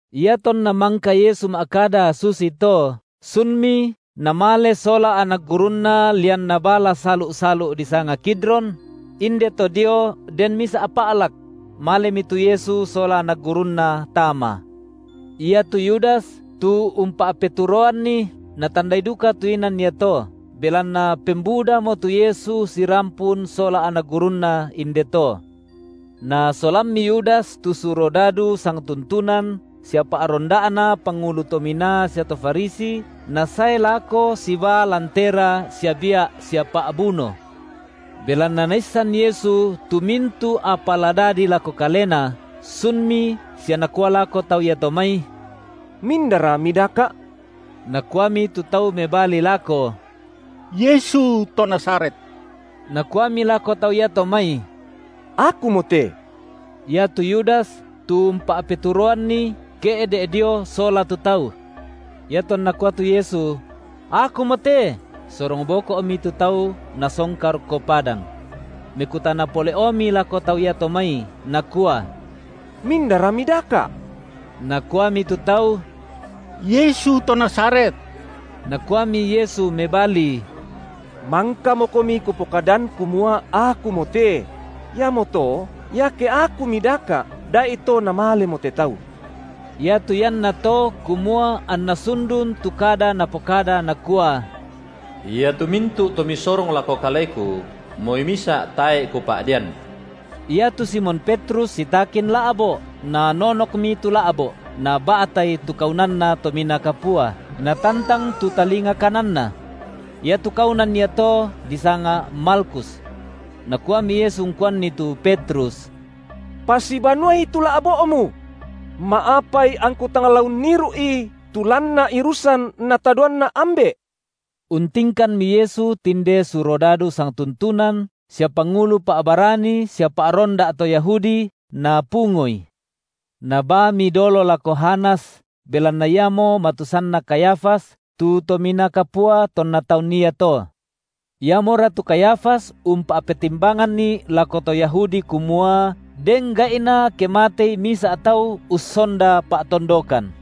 Iatonna mangka Yesu ma’kada susito, sunmi Namale sola anak gurunNa lian nabala salu’-salu’ disanga Kidron; inde to dio den misa’ pa’lak; malemi tu Yesu sola anak gurunNa tama. Iatu Yudas, tu umpa’peturoanNi, natandai duka tu inan iato, belanna pembudamo tu Yesu sirampun sola anak gurunNa inde to. Nasolammi Yudas tu surodadu sangtuntunan sia pa’ronda’na pangulu tominaa sia to Farisi, nasae lako sibaa lantera sia bia’ sia pa’buno. Belanna Naissan Yesu tu mintu’ apa la dadi lako Kalena, sunmi sia Nakua lako tau iato mai: Mindara mindaka’? Nakuami tu tau mebali lako: Yesu to Nazaret. Nakuami lako tau iato mai: Akumote. Iatu Yudas, tu umpa’peturoanNi ke’de’ dio sola tu tau. Iatonna kua tu Yesu: Akumote, sorong boko’mi tu tau nasongka rokko padang. Mekutana pole’omi lako tau iato mai, Nakua: Mindara midaka’? Nakuami tu tau: Yesu to Nazaret. Nakuami Yesu mebali: Mangkamokomi Kupokadan kumua Akumote; iamoto, iake Aku midaka’, da’ito namalemo te tau. Iatu iannato kumua anna sundun tu kada Napokada Nakua: Iatu mintu’ to Misorong lako Kaleku, moi misa’ tae’ Kupa’dean. Iatu Simon Petrus sitakin la’bo’, nanonokmi tu la’bo’, naba’tai tu kaunanna Tominaa Kapua, natantang tu talinga kananna. Iatu kaunan iato disanga Malkhus. Nakuami Yesu ungkuanni tu Petrus: Pasibanuai tu la’bo’mu. Ma’apai angKu tang la unniru’i tu lanna irusan NatadoanNa’ Ambe’? Untingkanmi Yesu tinde surodadu sangtuntunan sia pangulu pa’barani sia pa’ronda’ to Yahudi, napungoI; nabaami dolo lako Hanas belanna iamo matusanna Kayafas, tu tominaa kapua tonna taun iato. Iamora tu Kayafas umpa’petimbanganni lako to Yahudi kumua, den gai’na ke matei misa’ tau ussonda pa’tondokan.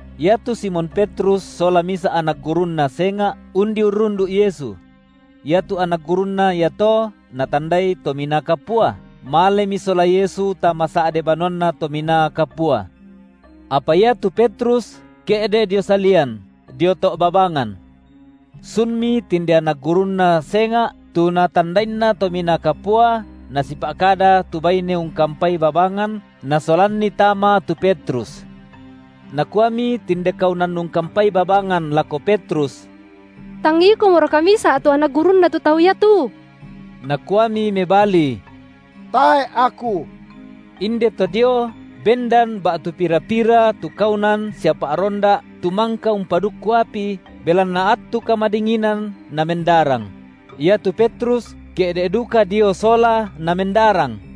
Iatu Simon Petrus sola misa’ anak gurunNa senga’, undi urrundu’ Yesu. Iatu anak gurunNa iato natandai Tominaa Kapua, malemi sola Yesu tama sa’de banuanna Tominaa Kapua; apa iatu Petrus, ke’de’ dio salian, dio to’ babangan. Sunmi tinde anak gurunNa senga’ tu natandainna tominaa kapua nasipa’kada tu baine ungkampai babangan nasolanni tama tu Petrus. Nakuami tinde kaunan ungkampai babangan lako Petrus: Tang ikomoraka misa’ tu anak gurunNa tu Tau iatu? Nakuami mebali: Tae’ aku. Indeto dio bendan ba’tu pira-pira tu kaunan sia pa’ronda’ tu mangka umpadukku api, belanna attu kamadinginan namendarang; iatu Petrus ke’de’ duka dio sola namendarang.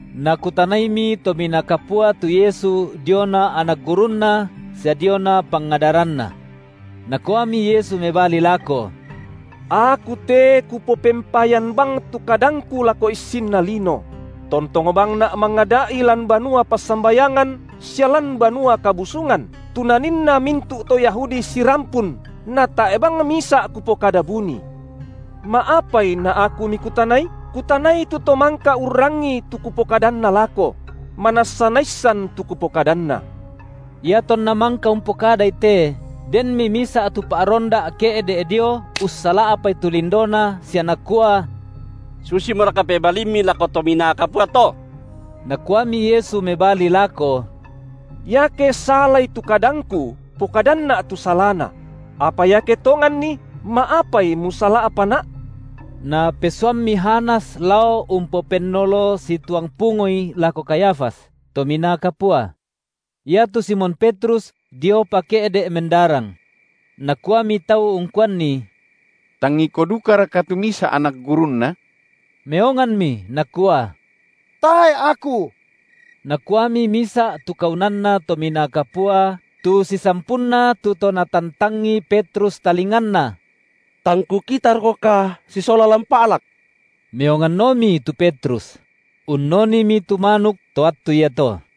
Nakutanaimi Tominaa Kapua tu Yesu diona anak gurunNa sia diona pangadaranNa. Nakuami Yesu mebali lako: Aku te Kupopempayan bang tu kadangKu lako issinna lino; tontong bangNa’ mangada’i lan banua passambayangan sia lan Banua Kabusungan, tu naninna mintu’ to Yahudi sirampun, natae’ bang misa’ Kupokada buni. Ma’apai na Aku mikutanai? Kutanai tu to mangka urrangii tu Kupokadanna lako; manassa naissan tu Kupokadanna. IatonNa mangka umpokadai te, denmi misa’ tu pa’ronda’ ke’de’ dio ussala’pai tu lindoNa sia nakua: Susimoraka pebalimMi lako tominaa kapua to? Nakuami Yesu mebali lako: Iake salai tu kadangKu, pokadanNa’ tu salana; apa iake tonganni, ma’apai musala’paNa’? Napesuammi Hanas lao umpopennolo situang pungoI lako Kayafas, tominaa kapua. Iatu Simon Petrus diopa ke’de’ mendarang. Nakuami tau ungkuanni: Tang iko dukaraka tu misa’ anak gurunNa? Meonganmi nakua: Tae’ aku. Nakuami misa’ tu kaunanna Tominaa Kapua, tu sisampunna tu to natantangi Petrus talinganna: Tang kukitarokoka sisola lan pa’lak? Meonganomi tu Petrus; unnonimi tu manuk to attu iato.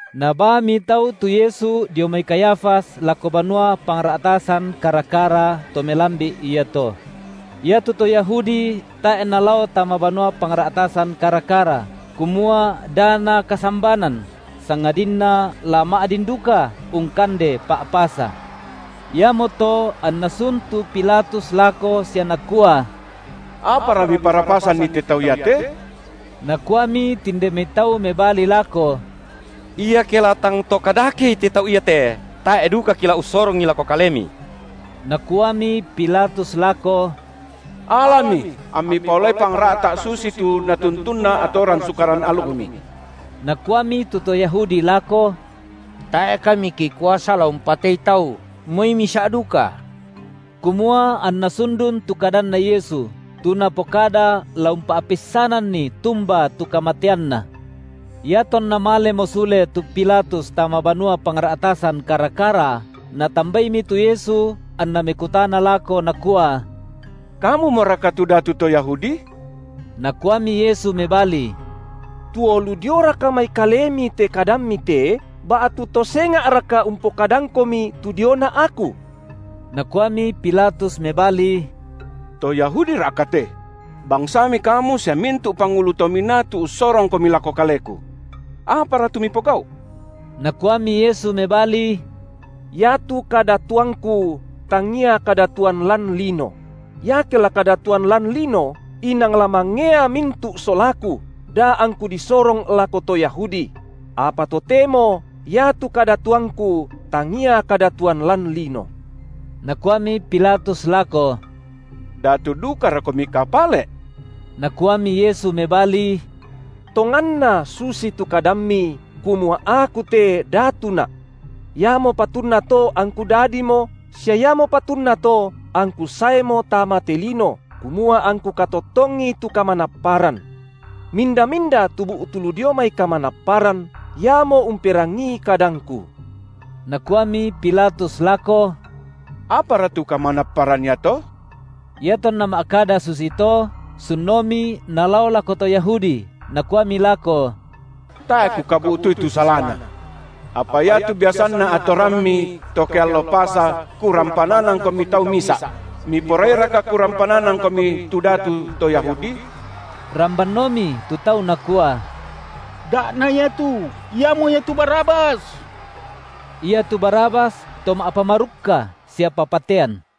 Nabaami tau tu Yesu dio mai Kayafas lako banua pangra’tasan kara-kara, to melambi’ iato. Iatu to Yahudi tae’ nalao tama banua pangra’tasan kara-kara, kumua da nakasambanan, sangadinna la ma’din duka ungkande Pa’pasa. Iamoto anna sun tu Pilatus lako sia nakua: Apara miparapasanni te tau iate? Nakuami tinde mai tau mebali lako: Iake la tang to kadakei te tau iate, tae’ duka kila ussorongi lako kalemi. Nakuami Pilatus lako: Alami, ammi paolai pangra’ta’ susitu natuntunna atoran sukaran alukmi! Nakuami tu to Yahudi lako: Tae’ kami kikuasa la umpatei tau, moi misa’ duka. Kumua anna sundun tu kadanNa Yesu, tu Napokada la umpa’peissananni tumba tu kamateanNa. Iatonna malemo sule tu Pilatus tama banua pangra’tasan kara-kara, natambaimi tu Yesu anna mekutana lako nakua: Kamumoraka tu datu to Yahudi? Nakuami Yesu mebali: Tuo lu dioraka mai kalemi te kadammi te, ba’tu to senga’raka umpokadangkomi tu diona Aku? Nakuami Pilatus mebali: To Yahudira’ka te? BangsaMi Kamu sia mintu’ pangulu to minaa tu ussorongKomi lako kaleku. Apara tu Mipogau’? Nakuami Yesu mebali: Iatu kadatuangKu tangia kadatuan lan lino; iake la kadatuan lan lino, inang la mangea mintu’ solaKu, da angKu disorong lako to Yahudi; apa totemo iatu kadatuangKu tangia kadatuan lan lino. Nakuami Pilatus lako: Datu dukaroKomika pale’? Nakuami Yesu mebali: Tonganna susitu kadammi, kumua Aku te datuNa’. Iamo patunna to angKu dadimo, sia iamo patunna to angKu saemo tama te lino, kumua angKu katottongi tu kamanapparan. Minda-minda tu bu’tu lu dio mai kamanapparan iamo umperangii kadangKu. Nakuami Pilatus lako: Apara tu kamanapparan iato? Iatonna ma’kada susito, sunomi nalao lako to Yahudi, nakuami lako: Tae’ kukabu’tui tu salaNa. Apa iatu biasanna atorammi to ke allo Pasa kurampananangkomi tau misa’; miporairaka kurampananangkomi tu datu to Yahudi? Rambanomi tu tau nakua: Da’ na Ia tu, iamo ia tu Barabas. Iatu Barabas to ma’pamarukka sia papatean.